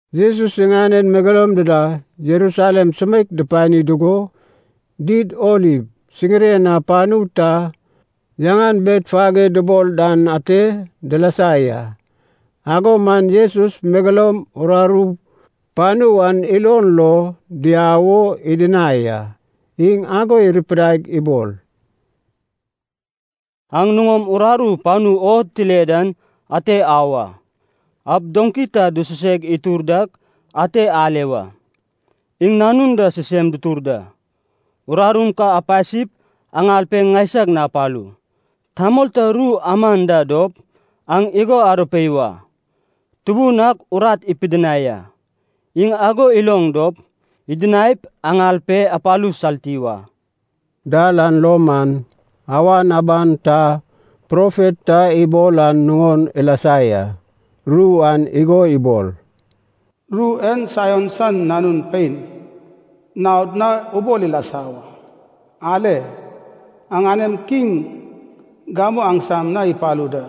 Jesus iŋanen megeloum dida Jerusalem sumeik dupani dugo, Did Oliv siŋiren na panu ta yaŋan Betfage dubol dan ate dilasa ya. Ago man Jesus megeloum uraru panu an ilon lo diau o idinai a. Iŋ ago irupidaig ibol, “Aŋ nuŋom urarum panu o tile dan ante au a. Aup doŋki ta dususeg itur dak ante ale wa, iŋ nanun da sisem dutur da. Urarum kam apasip aŋal pe ŋaisag na apalu. Tamol ta ru aman da dop, aŋ igo arupei wa, ‘Tubun ak urat ipidinai a.’ Iŋ ago iloŋ dop, idinaip aŋal pe apalu salti wa.” Dal an lo man, awan aban ta profet ta ibol an nuŋon ilasa ya. Ru an igo ibol, “Ru en Saion san Nanun Pein naod na ubol ilasa wa. Ale, aŋanem Kiŋ gamu aŋsam na ipalu da.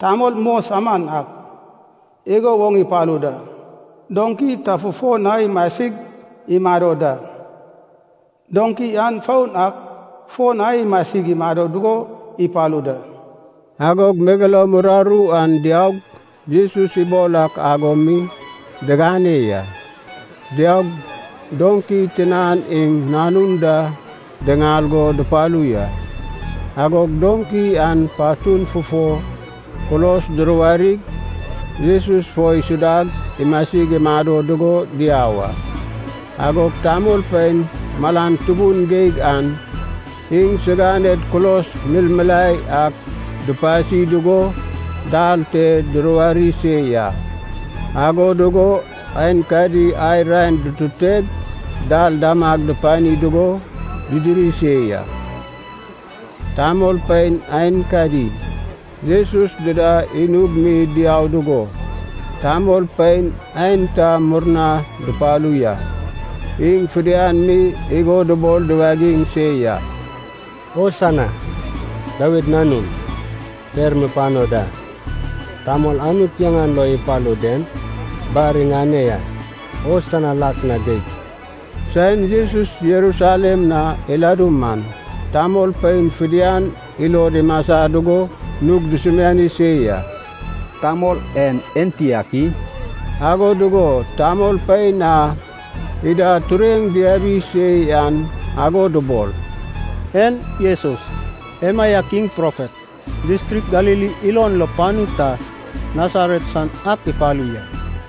Tamol mos aman ak igo woŋ ipalu da, doŋki ta fufo na imasig imado da. Doŋki an foun ak fo na imasig imado dugo ipalu da.” Agog megeloum uraru an diaug, Jesus ibol ak ago mi digane ya. Diaug, doŋki tinan iŋ nanun da diŋal go dupalu ya. Agog doŋki an patun fufo kulos duruwarig, Jesus fo isudag imasig imado dugo diau a. Agog tamolpein malan tubun geig an iŋsiganed kulos milmilae ak dupasi dugo dal te duruwari se ya. Ago dugo aenkadi ai raen dututeg dal damag dupani dugo didiri se ya. Tamolpein aenkadi, Jesus dida inug mi diau dugo, tamolpein aenta murna dupalu ya. Iŋ fidian mi igo dubol duwagiŋ se ya, “Hosana, Dawid Nanun, per mupano da! Tamol Anut yaŋan lo ipalu den bar iŋane ya! Hosana lak na geig!” Saen Jesus Jerusalem na iladu man, tamolpein fidian ilod imasa dugo nug dusumiani se ya, “Tamol en enti ak i?” Ago dugo tamolpein a ida tureŋ diabi se yan ago dubol, “En Jesus, emaiak iŋ profet, distrik Galili ilon lo panu ta Nasaret san ak ipalu ya.”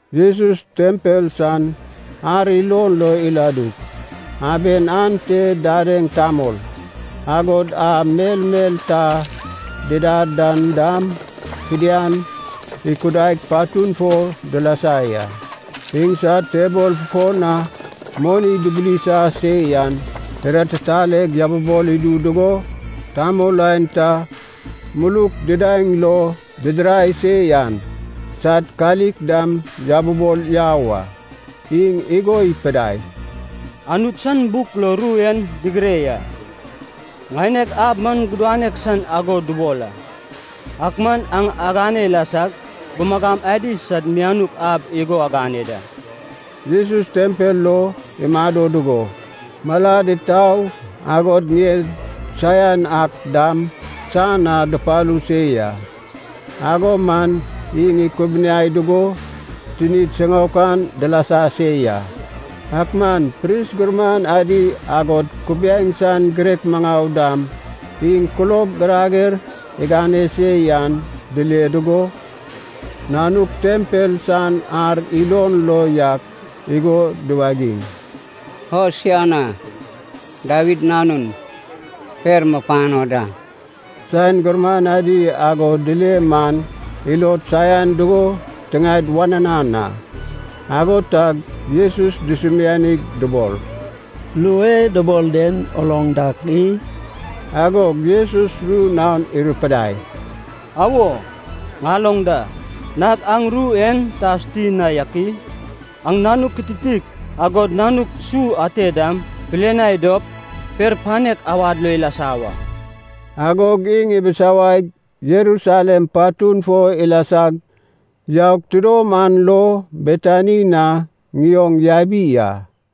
Jesus tempel san ar ilon lo iladug, aben ante didaeŋ tamol, agod a melmel ta didad dan dam fidian ikudaig patun fo dilasa ya. Iŋsad tebol fufo na moni dubulisa se yan, iratitaleg yabibol idu dugo, tamol aenta muluk didaeŋ lo didirai se yan sad kalik dam yabibol yau a. Iŋ igo ipidai, “Anut san buk lo ru en digire ya, ‘Ŋaineg ab man gudanek san ago dubol a,’ ak man aŋ agane ilasag ‘gumagam adi sad mianuk ab’ igo agane da.” Jesus tempel lo imado dugo, malad itau agod ŋied saian ak dam san na dupalu se ya, ago man iŋ ikubuniai dugo tinid siŋaokan dilasa se ya. Ak man pris gurman adi agod kubiaeŋ san girek maŋau dam iŋ kulob girager igane se yan dile dugo, nanuk tempel san ar ilon lo yak igo duwagiŋ, “Hosana Dawid Nanun, per mupano da!” Saen gurman adi ago dile man ilod saian dugo tiŋaed wananan a. Ago tag Jesus dusumianig dubol, “Ru e dubol den uloŋ dak i?” Agog Jesus ru naon irupidai, “Awo, ŋaloŋ da. Nag aŋ ru en ta asuti na yak i? ‘Oŋ nanuk kititik agod nanuk su ate dam pilianai dop, per panek awad lo ilasa wa.’” Agog iŋ ibisawaig Jerusalem patun fo ilasag yaug tidom an lo Betani na ŋioŋ yabi a.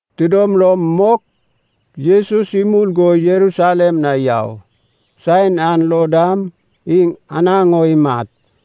Tidom lom mok Jesus imul go Jerusalem na yau, saen an lo dam iŋ anaŋ o imat.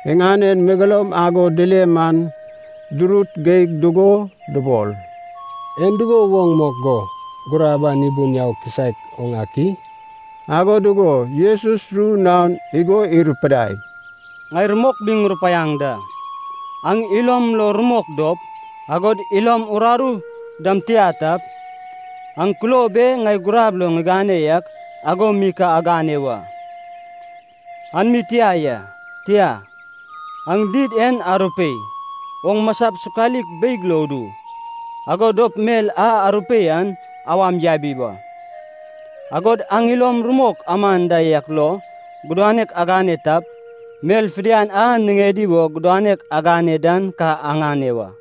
Iŋanen megeloum ago dile man durut geig dugo dubol, “En dugo woŋ mok go gurab an ibun yau kisaek oŋ ak i?” Ago dugo Jesus ru naon igo irupidai, “Ŋai rumok mi ŋurupaiaŋ da, aŋ ilom lo rumok dop, agod ilom uraru dam tia tap, aŋ kulob e ŋai gurab lo ŋigane yak ago mi ka agane wa. An mi tia ya, tia, aŋ did en arupeip, oŋ masap sokalik beig lo udu, ago dop mel a arupei an awam yabi wa. Agod aŋ ilom rumok aman da yak lo gudanek agane tap, mel fidian a niŋedi wo gudanek agane dan ka aŋane wa.”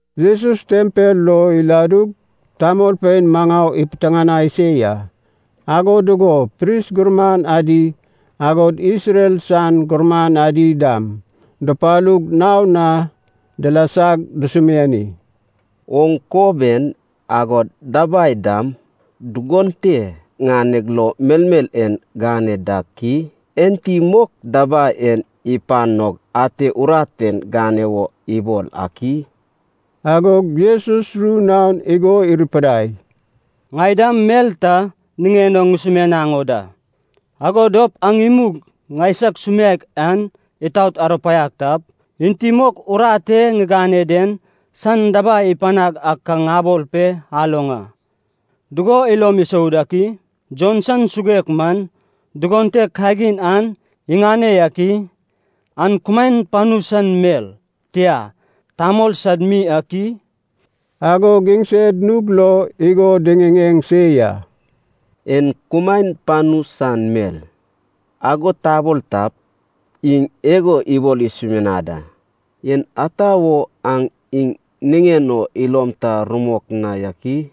Jesus tempel lo iladug tamolpein maŋau ipiteŋanai se ya. Ago dugo pris gurman adi agod Isrel san gurman adi dam dupalug naon na dilasag dusumiani, “Oŋ kob en agod dabai dam dugon te ŋaneg lo melmel en gane dak i? Enti mok dabai en ipanog ate urat en gane wo ibol ak i?” Agog Jesus ru naon igo irupidai, “Ŋai dam mel ta niŋen o ŋusumianaŋ o da. Ago dop aŋ imug ŋaisag sumianek an itaot arupaiag tap, enti mok urat e ŋigane den san dabai ipanag ak ka ŋabol pe aloŋ a. Dugo ilom isou dak i? Jon san suguek man, dugon te kagin an iŋane yak i? An kumaen panu san mel, tia, tamol sad mi ak i?” Agog iŋsed nug lo igo diŋiŋeŋ se ya. “En kumaen panu san mel, ago tabol tap, iŋ igo ibol isumianad a, ‘En ata wo aŋ iŋ niŋen o ilom ta rumok na yak i?’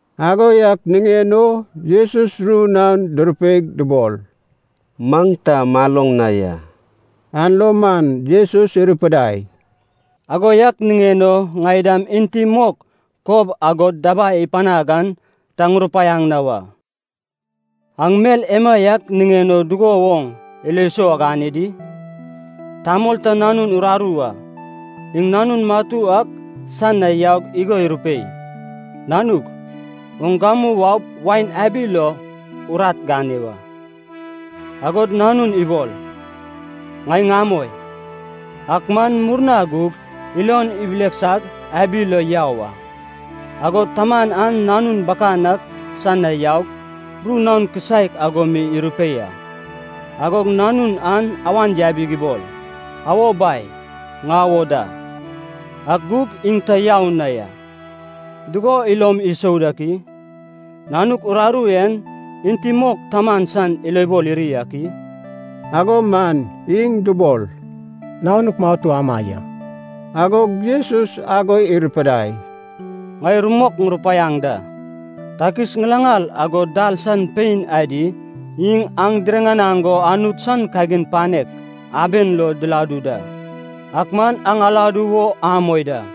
Ago yak niŋen o Jesus ru naon durupeig dubol, “Maŋ ta maloŋ na ya.” An lo man Jesus irupidai, “Ago yak niŋen o ŋai dam enti mok kob agod dabai ipanag an ta ŋurupaiaŋ na wa.” “Aŋ mel emaiak niŋen o dugo woŋ ilo sou agane di? Tamol ta nanun uraru a. Iŋ nanun matu ak san na yaug igo irupei, ‘Nanug, oŋ gamu waup wain abi lo urat gane wa.’ Agog nanun ibol, ‘Ŋai ŋamoi.’ Ak man murna gug ilon ibileksag abi lo yau a. Agod taman an nanun bakan ak san na yaug, ru naon kisaek ago mi irupei a. Agog nanun an awan yabig ibol, ‘Awo Bai, ŋau o da.’ Ak gug iŋ ta yau na ya. Dugo ilom isou dak i? Nanuk uraru en, enti mok taman san ilobol iri ak i?” Ago man iŋ dubol, “Nanuk matu ama ya.” Agog Jesus ago irupidai, “Ŋai rumok ŋurupaiaŋ da. Takis ŋilaŋal, agod dal san pein adi, iŋ aŋ diriŋanaŋ go Anut san kagin panek aben lo diladu da, ak man aŋ aladu wo amoi da.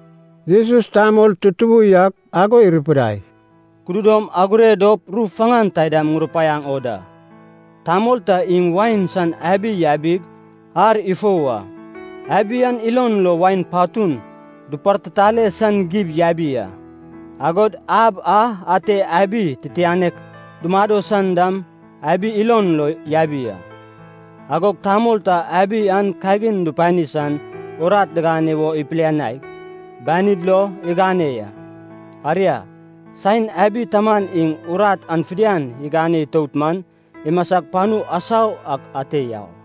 Jesus tamol tutubu yak ago irupidai, “Kududom agure dop ru faŋan taidam ŋurupaiaŋ o da. Tamol ta iŋ wain san abi yabig ar ifou a. Abi an ilon lo wain patun dupartitale san gib yabi a. Agod ab a ate abi titianek dumado san dam abi ilon lo yabi a. Agog tamol ta abi an kagin dupani san urat digane wo ipilianaig, banid lo igane ya. Aria, saen abi taman iŋ urat an fidian igane itout man, imasag panu asau ak ate yau a.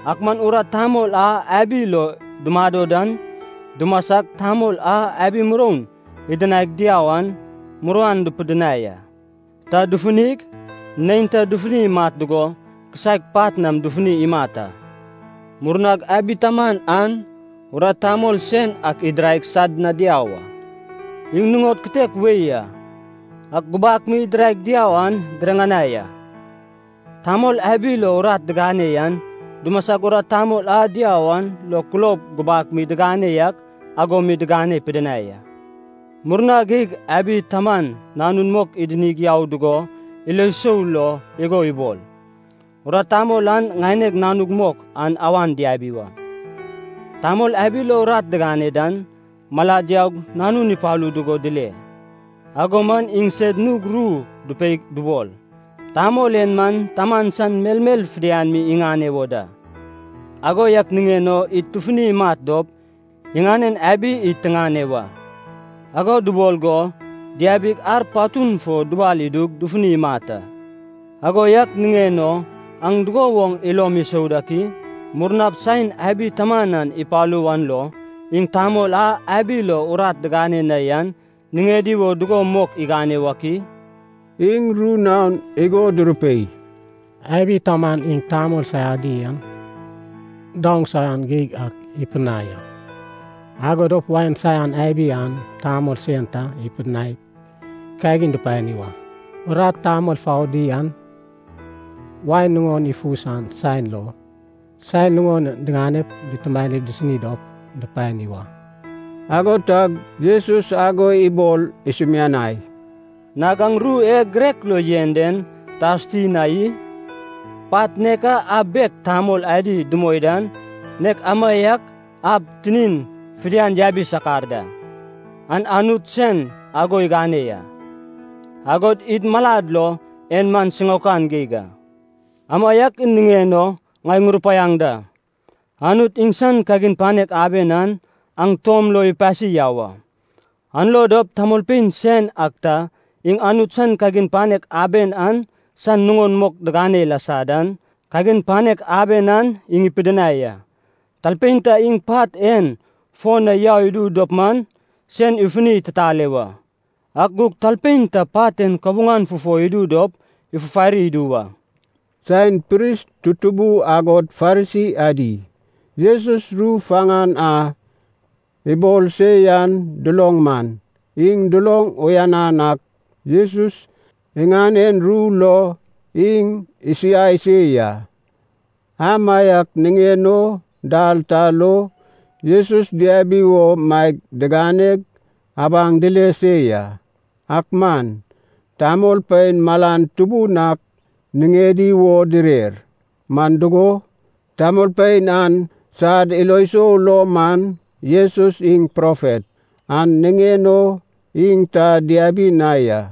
Ak man urat tamol a abi lo dumado dan dumasag, tamol a abi muroun idinaig diau an muruan dupidinai a. Ta dufunig, neinta dufuni imat dugo, kisaek pat nam dufuni imat a. Murnag abi taman an urat tamol sen ak idiraig sad na diau a. Iŋ nuŋod kitek wei a, a gubak mi idiraig diau an diriŋanai a. Tamol abi lo urat digane yan dumasag urat tamol a diau an lo kulob gubak mi digane yak ago mi digane pidinai a. Murna geig abi taman nanun mok idinig yau dugo ilo sou lo igo ibol, ‘Urat tamol an ŋaineg nanug mok an awan diabi wa.’ “Tamol abi lo urat digane dan, malad yaug nanun ipalu dugo dile. Ago man iŋsed nug ru dupeig dubol, ‘Tamol en man taman san melmel fidian mi iŋane wo da. Ago yak niŋen o id tufunip imat dop, iŋanen abi id tiŋane wa.’ Ago dubol go diabig ar patun fo dubal idug dufunig imat a. “Ago yak niŋen o aŋ dugo woŋ ilom isou dak i? Murnap, saen abi taman an ipalu wan lo, iŋ tamol a abi lo urat digane na yan niŋedi wo dugo mok igane wak i?” Iŋ ru naon igo durupei, “Abi taman iŋ tamol saiadi an daoŋ saian geig ak ipidinai a. Ago dop wain san abi an tamol sen ta ipidinaip kagin dupani wa. Urat tamol foudi an, wain nuŋon ifu san saen lo, san nuŋon diŋanep dutumanip disini dop dupani wa.” Ago tag Jesus ago ibol isumianai, “Nag aŋ ru e girek lo yen den ta asuti na i? ‘Pat nek a ab bek tamol adi dumoi dan, nek amaiak ab tinin fidian yabi sakar da. An Anut sen ago igane ya, agod id malad lo en man siŋaokan geig a.’ “Amaiak niŋen o ŋai ŋurupaiaŋ da, Anut iŋsan kagin panek aben an, aŋ tuom lo ipasi yau a. An lo dop tamolpein sen ak ta, iŋ Anut san kagin panek aben an san nuŋon mok digane ilasa dan, kagin panek aben an iŋ ipidinai a. Talpein ta iŋ pat en fo na yau idu dop man, sen ifuni ititale wa. Ak gug talpein ta pat en kabuŋan fufo idu dop, ifufari idu wa.” Saen pris tutubu agod Farisi adi, Jesus ru faŋan a ibol se yan duloŋ man, iŋ duloŋ uyanan ak Jesus iŋanen ru lo iŋ isiai se ya. Amaiak niŋen o dal ta lo Jesus diabi wo maeg diganeg abaŋ dile se ya. Ak man tamolpein malan tubun ak niŋedi wo direr, man dugo, tamolpein an sad ilo sou lo man Jesus iŋ profet, an niŋen o iŋ ta diabi na ya.